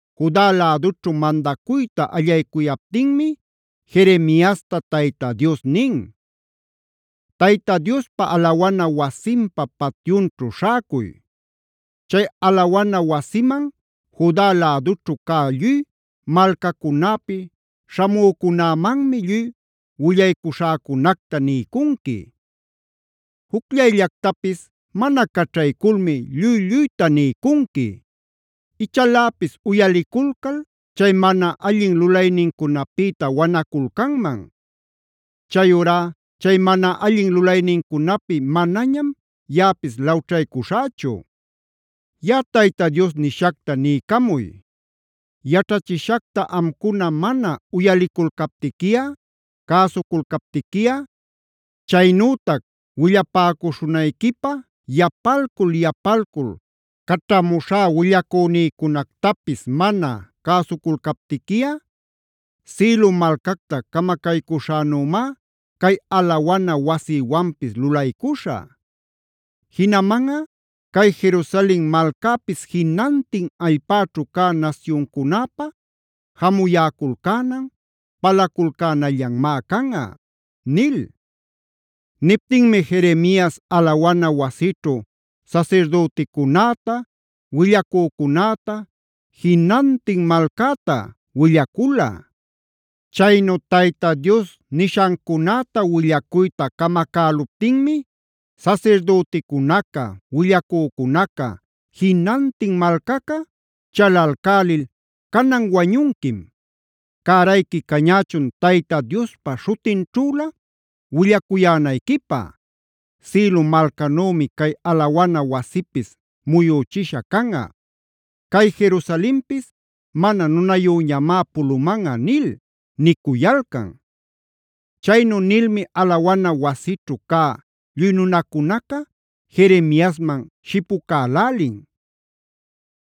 Juda lädućhu mandacuyta allaycuyaptinmi Jeremiasta Tayta Dios nin: “Tayta Diospa alawana wasinpa patyunćhu śhäcuy. Chay alawana wasiman Juda lädućhu cä lluy malcacunäpi śhamücunämanmi lluy willaycuśhäcunacta niycunqui. Jucllayllactapis mana caćhayculmi lluy-lluyta niycunqui. Ichaläpis uyaliculcal chay mana allin lulaynincunapïta wanaculcanman. Chayurá chay mana allin lulaynincunapi manañam yaꞌapis lawćhaycuśhächu. “Yaꞌa Tayta Dios nishacta niycamuy: ‘Yaćhachishacta amcuna mana uyaliculcaptiquiꞌa, cäsuculcaptiquiꞌa, chaynütac willapäcuśhunayquipä yapalcul-yapalcul caćhamuśhá willacünïcunactapis mana cäsuculcaptiquiꞌa, Silo malcactab camacaycuśhänümá cay alawana wasïwanpis lulaycuśhä. Jinamanꞌa cay Jerusalen malcäpis jinantin allpäćhu cä nasyuncunäpä jamuyäculcänan, palaculcänallanmá canꞌa’” nil. Niptinmi Jeremias alawana wasićhu sasirdüticunäta, willacücunäta, jinantin malcäta willacula. Chaynu Tayta Dios nishancunäta willacuyta camacäluptinmi sasirdüticunaca, willacücunaca, jinantin malcaca chalalcälil: “Canan wañunquim. Cärayqui cañächun Tayta Diospa śhutinćhülä willacuyänayquipä: ‘Silo malcanümi cay alawana wasipis muyüchisha canꞌa. Cay Jerusalenpis mana nunayüñamá pulumanꞌa’ nil” nicuyalcan. Chaynu nilmi alawana wasićhu cä lluy nunacunaca Jeremiasman shipucälälin.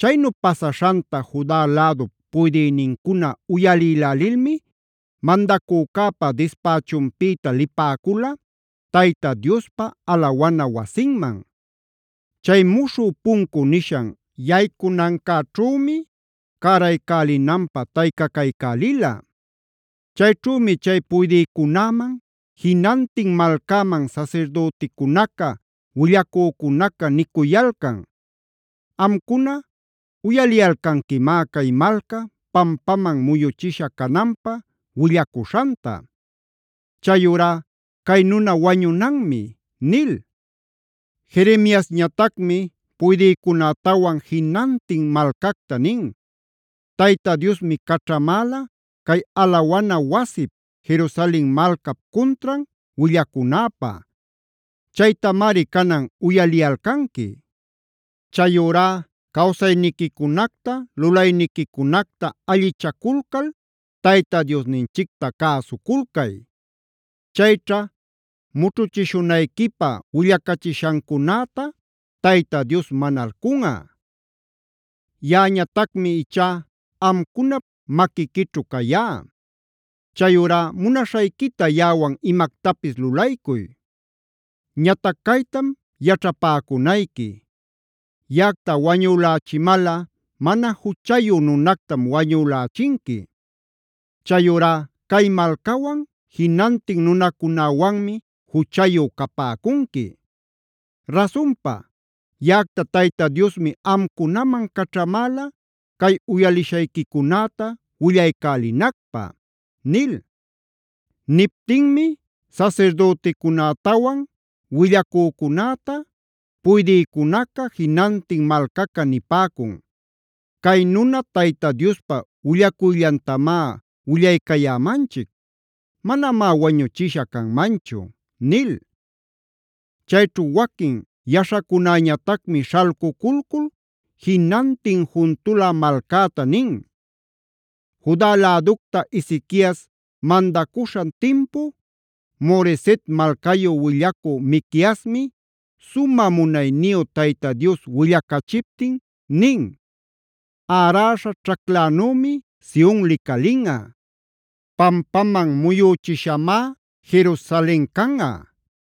Chaynu pasaśhanta Juda lädup puydïnincuna uyalïlälilmi mandacücäpa dispächunpïta lipäcula Tayta Diospa alawana wasinman. Chay Muśhü Puncu nishan yaycunancäćhümi cäraycälinanpä taycacaycälila. Chayćhümi chay puydïcunäman, jinantin malcäman sasirdüticunaca, willacücunaca nicuyalcan: “Amcuna uyaliyalcanquimá cay malca pampaman muyuchisha cananpä willacuśhanta. Chayurá cay nuna wañunanmi” nil. Jeremiasñatacmi puydïcunätawan jinantin malcacta nin: “Tayta Diosmi caćhamäla cay alawana wasip, Jerusalen malcap cuntran willacunäpä. Chaytamari canan uyaliyalcanqui. Chayurá cawsayniquicunacta, lulayniquicunacta allichaculcal Tayta Diosninchicta cäsuculcay. Chayćha mućhuchishunayquipä willacachishancunäta Tayta Dios manalcunꞌa. Yaꞌañatacmi ichá amcunap maquiquićhu cayá. Chayurá munaśhayquita yaꞌawan imactapis lulaycuy. Ñatac caytam yaćhapäcunayqui: Yaꞌacta wañülächimalꞌa mana juchayu nunactam wañülächinqui; chayurá cay malcawan, jinantin nunacunäwanmi juchayu capäcunqui. Rasunpa, yaꞌacta Tayta Diosmi amcunaman caćhamäla cay uyalishayquicunäta willaycälinacpä” nil. Niptinmi sasirdüticunätawan willacücunäta puydïcunaca, jinantin malcaca nipäcun: “Cay nuna Tayta Diospa willacuyllantamá willaycayämanchic; manamá wañuchisha canmanchu” nil. Chayćhu waquin yaśhacunäñatacmi śhalcuculcul jinantin juntulä malcäta nin: “Juda läducta Ezequias mandacuśhan timpu, Moreset malcayu willacü Miqueasmi, sumä munayniyu Tayta Dios willacachiptin nin: “ ‘Äräśha ćhaclanümi Sion licalinꞌa; pampaman muyüchishamá Jerusalen canꞌa.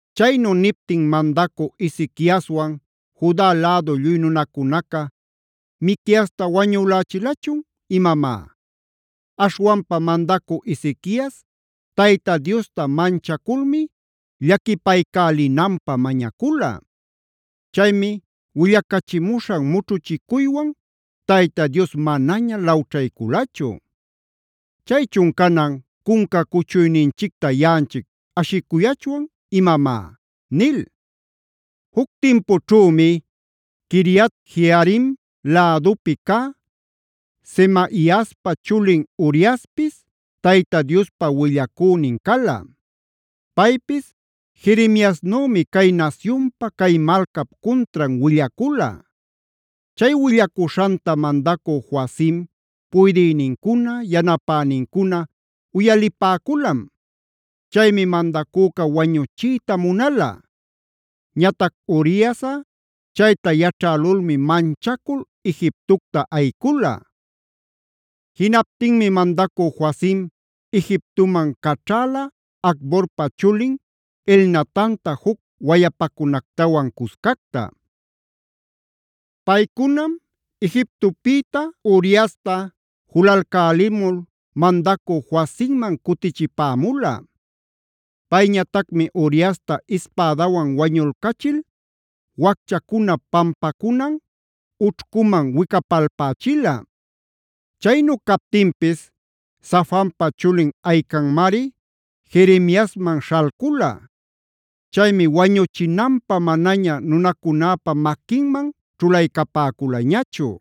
“Chaynu niptin mandacü Ezequiaswan Juda lädu lluy nunacunaca ¿Miqueasta wañülächilachun imamá? Aśhwanpa mandacü Ezequias Tayta Diosta manchaculmi llaquipaycälinanpä mañacula. Chaymi willacachimuśhan mućhuchicuywan Tayta Dios manaña lawćhayculachu. Chaychun canan, ¿cunca cuchuyninchicta yaꞌanchic ashicuyachwan imamá?” nil. Juc timpućhümi Quiriat-jearim lädupi cä Semaiaspa chulin Uriaspis Tayta Diospa willacünin cala. Paypis Jeremiasnümi cay nasyunpa, cay malcap cuntran willacula. Chay willacuśhanta mandacü Joacim, puydïnincuna, yanapänincuna uyalipäculam. Chaymi mandacüca wañüchiyta munala. Ñatac Uriasꞌa chayta yaćhälulmi manchacul Egiptocta ayicula. Jinaptinmi mandacü Joacim Egiptoman caćhala Acborpa chulin Elnatanta juc wayapacunactawan cuscacta. Paycunam Egiptopïta Uriasta julalcälimul mandacü Joacimman cutichipämula. Payñatacmi Uriasta ispädawan wañulcachil, wacchacuna pampacunan ućhcuman wicapalpächila. Chaynu captinpis Safanpa chulin Ahicanmari Jeremiasman śhalcula. Chaymi wañuchinanpä manaña nunacunäpa maquinman ćhulaycapäculañachu.